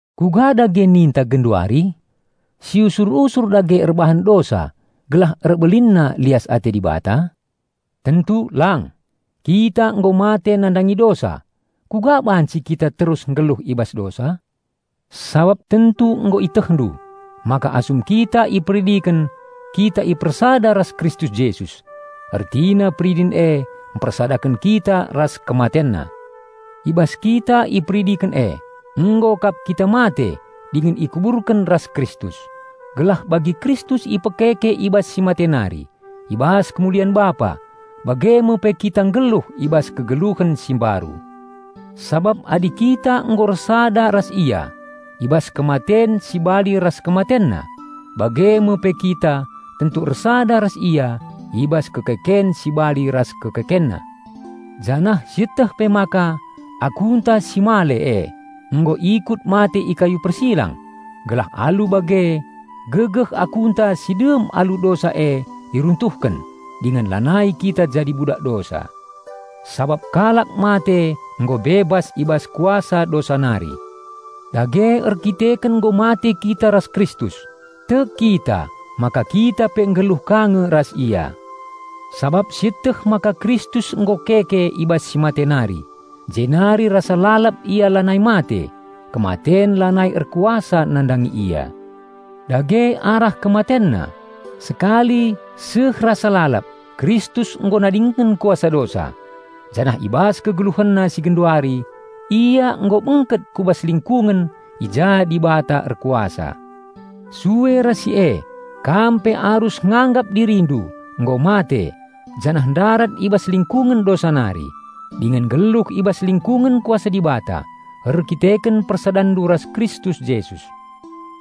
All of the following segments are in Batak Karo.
Kuga dage ninta genduari? Siusur-usur dage erbahan dosa gelah erbelinna lias ate Dibata? Tentu lang! Kita nggo mate nandangi dosa; kuga banci kita terus nggeluh i bas dosa? Sabap tentu nggo ietehndu maka asum kita iperidiken kita ipersada ras Kristus Jesus; ertina peridin e mpersadaken kita ras KematenNa. I bas kita iperidiken e, nggo kap kita mate dingen ikuburken ras Kristus, gelah bagi Kristus ipekeke i bas si mate nari i bas kemulian Bapa, bage me pe kita nggeluh i bas kegeluhen si mbaru. Sabap adi kita nggo ersada ras Ia i bas kematen si bali ras KematenNa, bage me pe kita tentu ersada ras Ia i bas kekeken si bali ras KekekenNa. Janah sieteh pe maka "aku"-nta si male e nggo ikut mate i kayu persilang, gelah alu bage gegeh "aku"-nta si dem alu dosa e iruntuhken, dingen lanai kita jadi budak dosa. Sabap kalak mate nggo bebas i bas kuasa dosa nari. Dage erkiteken nggo mate kita ras Kristus, tek kita maka kita pe nggeluh ka nge ras Ia. Sabap sieteh maka Kristus nggo keke i bas si mate nari jenari rasa lalap Ia lanai mate, kematen lanai erkuasa nandangi Ia. Dage arah KematenNa, sekali seh rasa lalap Kristus nggo nadingken kuasa dosa; janah i bas KegeluhenNa si genduari Ia nggo bengket ku bas lingkungen i ja Dibata erkuasa. Sue ras si e kam pe arus nganggap dirindu nggo mate janah ndarat i bas lingkungen dosa nari, dingen nggeluh i bas lingkungen kuasa Dibata, erkiteken persadanndu ras Kristus Jesus.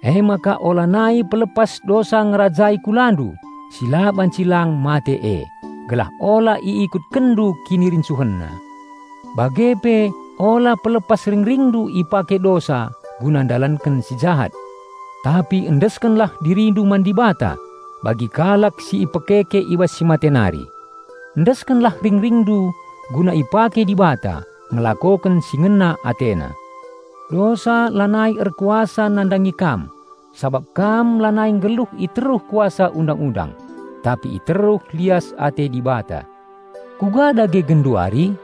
Emaka ulanai pelepas dosa ngerajai kulandu si la banci lang mate e, gelah ula iikutkenndu kinirincuhenna. Bage pe ula pelepas ringringndu ipake dosa guna ndalanken si jahat. Tapi endeskenlah dirindu man Dibata, bagi kalak si ipekeke i bas si mate nari. Endeskenlah ringringndu guna ipake Dibata ngelakoken si ngena AteNa. Dosa lanai erkuasa nandangi kam, sabap kam lanai nggeluh i teruh kuasa Undang-undang, tapi i teruh lias ate Dibata. Kuga dage genduari?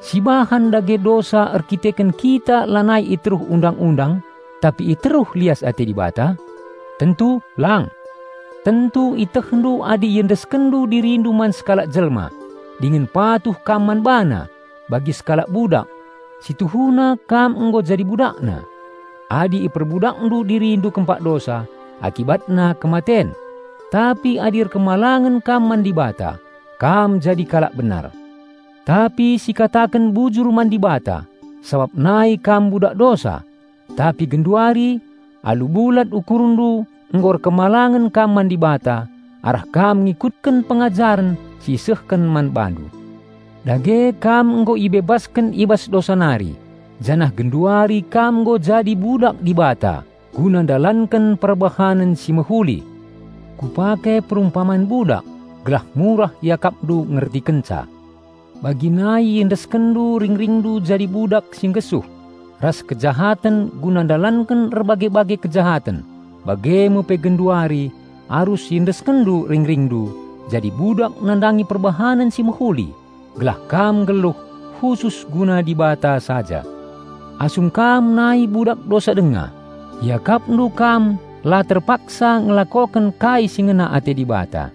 Sibahan dage dosa erdandanken kita lanai i teruh Undang-undang, tapi i teruh lias ate Dibata? Tentu lang! Tentu ietehndu adi iendeskenndu dirindu man sekalak jelma dingen patuh kam man bana bagi sekalak budak, si tuhuna kam nggo jadi budakna. Adi iperbudakndu dirindu kempak dosa, akibatna kematen, tapi adi patuh kam man Dibata, kam jadi kalak benar. Tapi sikataken bujur man Dibata, sabap nai kam budak dosa, tapi genduari, alu bulat ukurndu nggo patuh kam man Dibata arah kam ngikutken pengajaren si isehken man bandu. Dage kam nggo ibebasken i bas dosa nari janah genduari kam nggo jadi "budak" Dibata guna ndalanken perbahanen si mehuli. Kupake perumpaman budak gelah murah iakapndu ngertikenca. Bagi nai iendeskenndu ringringndu jadi budak si nggesuh ras kejahaten guna ndalanken erbage-bage kejahaten bage me pe genduari arus iendeskenndu ringringndu jadi budak nandangi perbahanen si mehuli gelah kam nggeluh khusus guna Dibata saja. Asum kam nai budak dosa denga, iakapndu kam la terpaksa ngelakoken kai si ngena ate Dibata.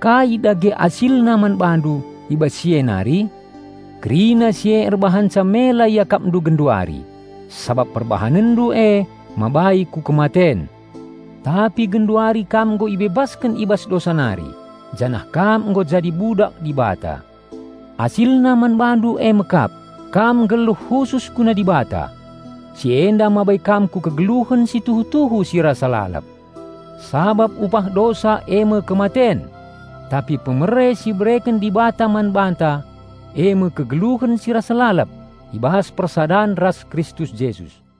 Kai dage asilna man bandu i bas si e nari? Kerina si e erbahanca mela iakapndu genduari, sabap perbahanenndu e mabai ku kematen. Tapi genduari kam nggo ibebasken i bas dosa nari, janah kam nggo jadi "budak" Dibata. Asilna man bandu eme kap, kam nggeluh khusus guna Dibata. Si enda mabai kam ku kegeluhen si tuhu-tuhu si rasa lalap. Sabap upah dosa eme kematen; tapi pemere si ibereken Dibata man banta eme kegeluhen si rasa lalap i bas persadan ras Kristus Jesus.